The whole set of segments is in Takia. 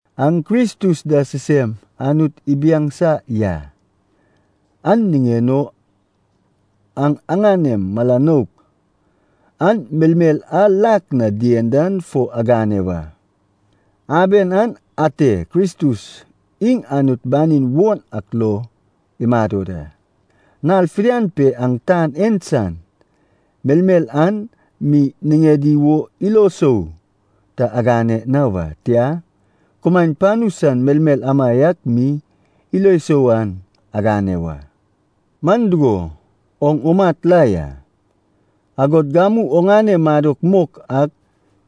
Aŋ Kristus da sisem Anut ibiaŋsa ya. An niŋen o aŋ aŋanem mala nouk an melmel a lak na dien dan fo agane wa. Aben an ate Kristus iŋ Anut banin won ak lo imado da. Nal fidian pe aŋ tan en san melmel an mi niŋedi wo ilo sou ta agane na wa, tia, kumaen panu san melmel amaiak mi ilo sou an agane wa. Man dugo, oŋ umat la ya, agod gamu oŋane madok mok ak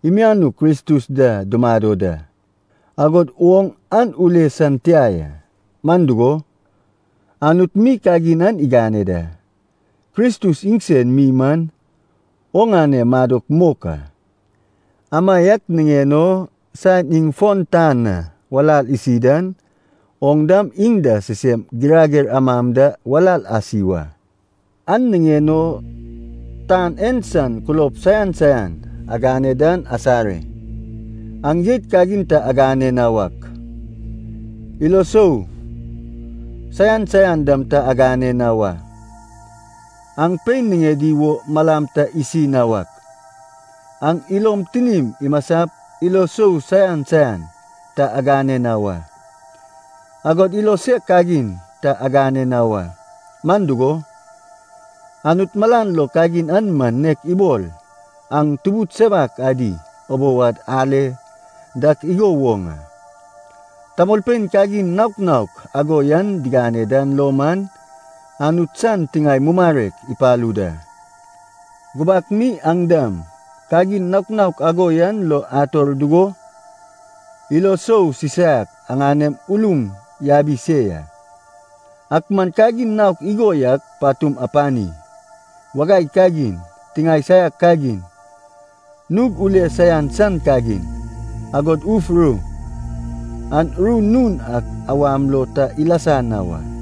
imianuk Kristus da dumado da, agod oŋ an ule san tia ya, man dugo, Anut mi kagin an igane da. Kristus iŋsen mi man oŋane madok mok a. Amaiak niŋen o saen iŋ fon tan na walal isi dan, oŋ dam iŋ da sisem girager amam da walal asi wa. An niŋen o tan en san kulob saian saian agane dan asare. Aŋ jeit kagin ta agane na wak, ilo isou saian saian dam ta agane na wa. Aŋ pein niŋedi wo malam ta isi na wak, aŋ ilom tinim imasap ilo sou saian saian ta agane na wa. Agod ilo sek kagin ta gane na wa, man dugo, Anut malan lo kagin an man nek ibol aŋ tubud sewak adi ubou ad ale dak igo woŋ a. Tamolpein kagin naok naok ago yan digane dan lo man, Anut san tiŋae mumarek ipalu da. Gubak mi aŋ dam, kagin naok naok ago yan lo ator dugo, ilo sou sisaiak aŋanem ulum yabi se ya. Ak man kagin naok igo yak patum apani: wagai kagin, tiŋae saiak kagin, nug ule saian san kagin, agod uf ru. Aŋ ru nun ak awam lo ta ilasa na wa.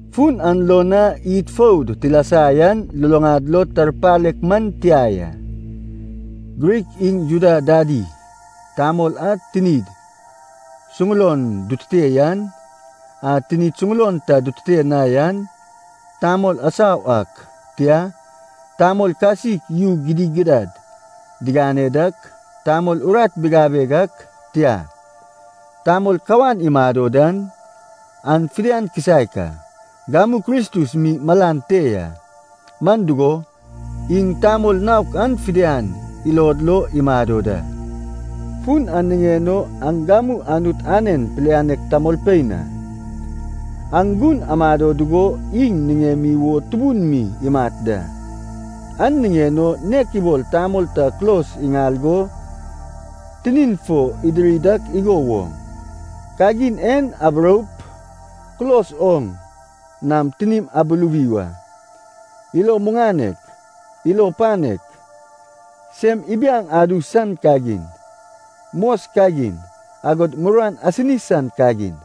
Fun an lo na id foud tilasa yan luluŋad lo tarpalek man tia ya. Grik iŋ Juda dadi, tamol a tinid suŋulon dutute yan, a tinid suŋulon ta dutute na yan, tamol asau ak, tia, tamol kasik yu gidigidad digane dak, tamol urat bigabeg ak, tia, tamol kawan imado dan, an fidian kisaek a. Gamu Kristus mi malan te ya, man dugo, iŋ tamol naok an fidian ilod lo imado da. Fun an niŋen o, aŋ gamu Anut anen pilianek tamolpein a, aŋ gun amado dugo iŋ niŋemi wo tubun mi imat da. An niŋen o nek ibol tamol ta kulos iŋal go tinin fo idiri dak igo woŋ, kagin en aburoup kulos oŋ nam tinim abuluwi wa: ilo muŋanek, ilo panek, sem ibiaŋ adu san kagin, mos kagin, agod muruan asini san kagin.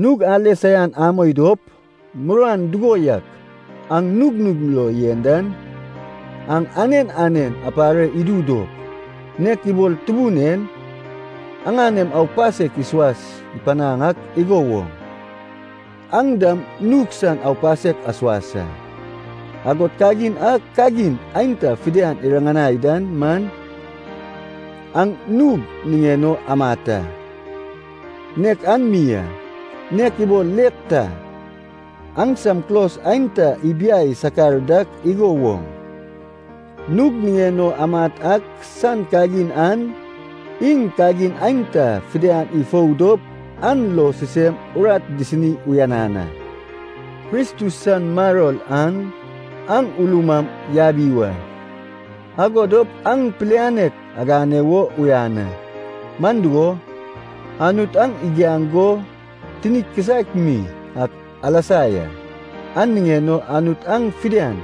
Nug ale saian amoi dop, muruan dugo yak aŋ nugnug lo yen dan, aŋ anen anen apare idu dop, nek ibol Tubun en aŋanem aupasek isuas panaŋ ak igo woŋ, aŋ dam nug san aupasek asuas a. Agod kagin a kagin aenta fidian iriŋanai dan man, aŋ nug niŋen o amat a, nek an mi a. Nek ibol let ta, aŋsam kulos aenta ibiai sakar dak igo woŋ, nug niŋen o amat ak san kagin an, iŋ kagin aenta fidian ifou dop an lo sisem urat disini uyanan a. Kristus san maror an aŋ ulum am yabi wa, ago dop aŋ pilianek agane wo uyan a. Man dugo, Anut aŋ igiaŋ go tinik kisaek mi ak alasa ya, an niŋen o Anut aŋ fidian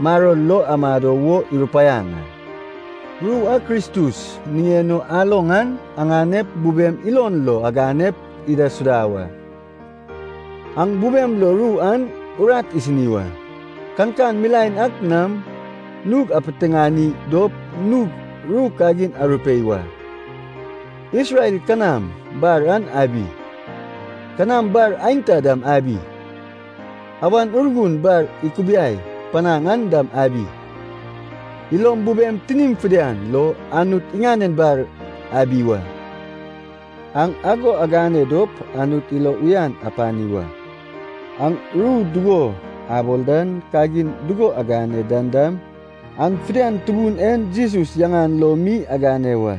maror lo amado wo irupaiaŋ a. Ru a Kristus niŋen o aloŋ an aŋanep bubem ilon lo aganep idaisuda wa. Aŋ bubem lo ru an urat isini wa. Kankan milaen ak nam nug apiteŋani dop nug ru kagin arupei wa. Isrel kanam bar an abi, kanam bar aenta dam abi, Awan Urgun bar ikubiai panaŋ an dam abi; ilom bubem tinim fidian lo Anut niŋen bar abi wa. Aŋ ago agane dop Anut ilo uyan apani wa. Aŋ ru dugo abol dan, kagin dugo agane dan dam, an fidian Tubun en Jesus yaŋan lo mi agane wa.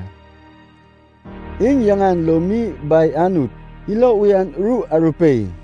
Iŋ yaŋan lo mi Bai Anut ilo uyan ru arupei.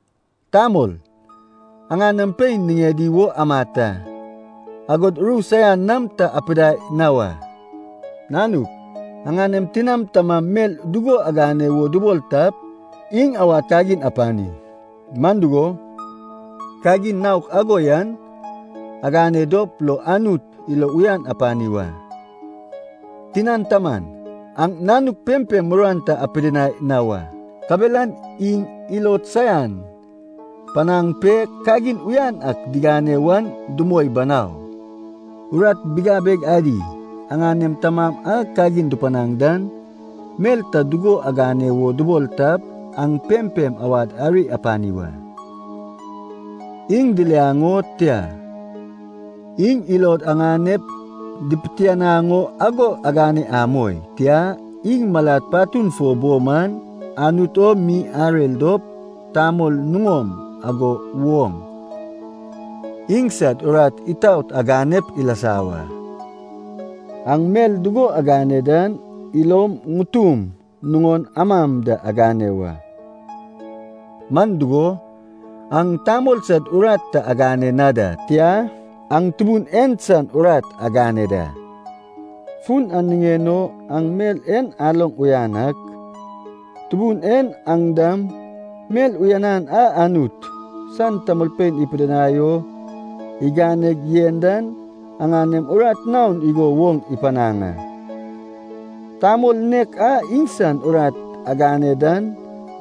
Tamol, aŋanem pein niŋedi wo amat a, agod ru saian nam ta apidai na wa. Nanuk, aŋanem tinam tamam mel dugo agane wo dubol tap, iŋ awad kagin apani. Man dugo, kagin naok ago yan, agane dop lo Anut ilo uyan apani wa. Tinan taman, aŋ nanuk pempem muruan ta apidinai na wa, kabelan iŋ ilod saian panaŋ pe, kagin uyan ak digane wan dumoi banau. Urat bigabeg adi, aŋanem tamam a kagin dupanaŋ dan, mel ta dugo agane wo dubol tap, aŋ pempem awad ari apani wa. Iŋ diliaŋ o, tia, iŋ ilod aŋanep dipitianaŋ o ago agane amoi. Tia, iŋ malad patun fo bo man, Anut o mi arer dop, tamol nuŋom ago woŋ, iŋsad urat itaot aganep ilasa wa. Aŋ mel dugo agane dan, ilom ŋutum nuŋon amam da agane wa. Man dugo, aŋ tamol sad urat ta agane na da, tia, aŋ Tubun en san urat agane da. Fun an niŋen o, aŋ mel en aloŋ uyan ak, Tubun en aŋ dam mel uyanan a Anut san tamolpein ipidinai o iganeg yen dan, aŋanem urat naon igo woŋ ipanaŋ a. Tamol nek a iŋsan urat agane dan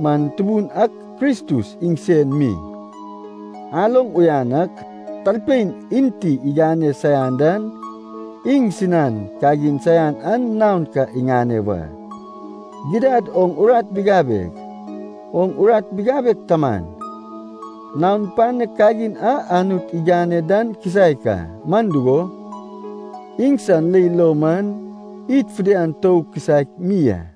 man Tubun ak Kristus iŋsen mi. Aloŋ uyan ak, talpein enti igane saian dan, iŋsinan kagin saian an naon ka iŋane wa. Gidad oŋ urat bigabeg, oŋ urat bigabeg taman, naon panek kagin a Anut igane dan kisaek a, man dugo, iŋsan leil lo man, id fidian tou kisaek mi a.